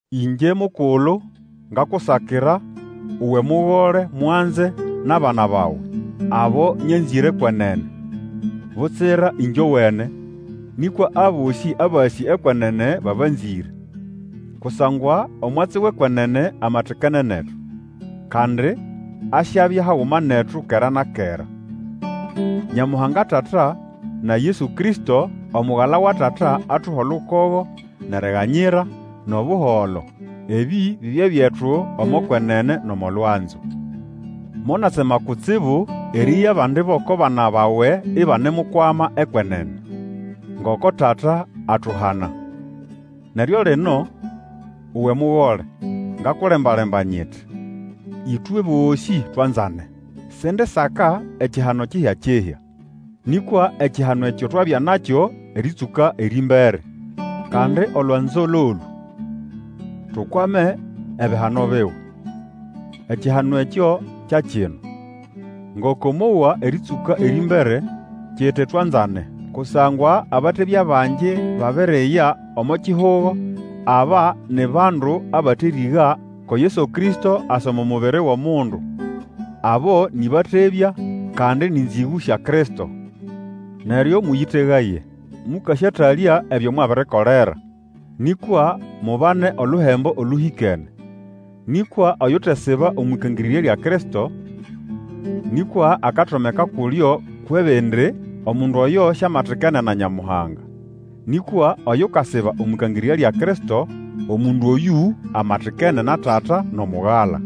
Ĩngye mukulu ngakusakira, uwe mugole mwanze nʼabana bawe, abo nyanzĩre kwenene. Butsira ĩngyowene, nĩkwa abosĩ abasĩ ekwenene, babanziĩre. Kusangwa omwatsi wʼekwenene amatikene netu, kandi asyabya haguma netu kera na kera. Nyamuhanga Tata, na Yesu Kristo, Omugala wa Tata, atuhe olukogo, nʼeriganyira, nʼobuholo. Ebi bibye byetu omo kwenene nʼomo lwanzo. Monatsema kutsibu erieya abandi bʼoko bana bawe ibanemukwama ekwenene, ngoko Tata atuhana. Neryo lino, uwe mugole, ngakulemba-lemba nyiti, ĩtwe bosĩ twanzane. Sindisaka ekihano kihya-kihya, nĩkwa ekihano ekyo twabya nakyo erĩtsũka erĩmbere. Kandi olwanzo lolũ: tukwame ebihano biwe. Ekihano ekyo kya kino: ngoko mwowa erĩtsũka erĩmbere, kiti twanzane. Kusangwa abatebya bangi babiriya omo kihugo. Aba ni bandu abaterĩga ko Yesu Kristo asa omo mubiri wʼomundu. Abo ni batebya, kandi ni nzĩgũ sya Kristo. Neryo mũyĩtegaye, mũkasyatalya ebyo mwabirikolera, nĩkwa mubane oluhembo olũhikene. Nikwa oyutesiba omwʼĩkangĩrĩrya lya Kristo, nĩkwa akatomeka kulyo kwʼebindi, omundu oyo siamatikene na Nyamuhanga. Nĩkwa Oyukasiba omwʼĩkangirirya lya Kristo, omundu oyũ amatikene na Tata nʼomugala.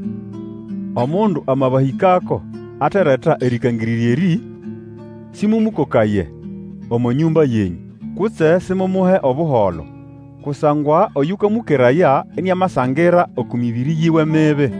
Omundu amabahĩkako, atereta erĩkangĩrĩrya erĩ, sĩmũmũkokaye omo nyũmba yenyũ, kutse simumuhe Obuholo. Kusangwa oyũkamũkeraya iniamasangira oko mĩbĩrĩ yiwe mibi.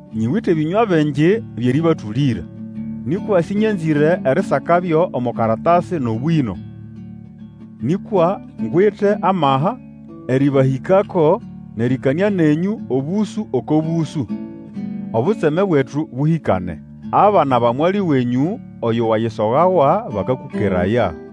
Nyiwite ebĩnywa bingi byʼerĩbatũlĩra, nikwa sĩnyanzĩre erisakabyo omo karatasi nʼobwĩno. Nĩkwa ngwite amaha erĩbahĩkako nʼerĩkanĩa nenyũ obũsũ oko bũsũ, obutseme bwetu bũhĩkane. Abana ba mwali wenyũ oyo wayisogawa, bakakũkeraya.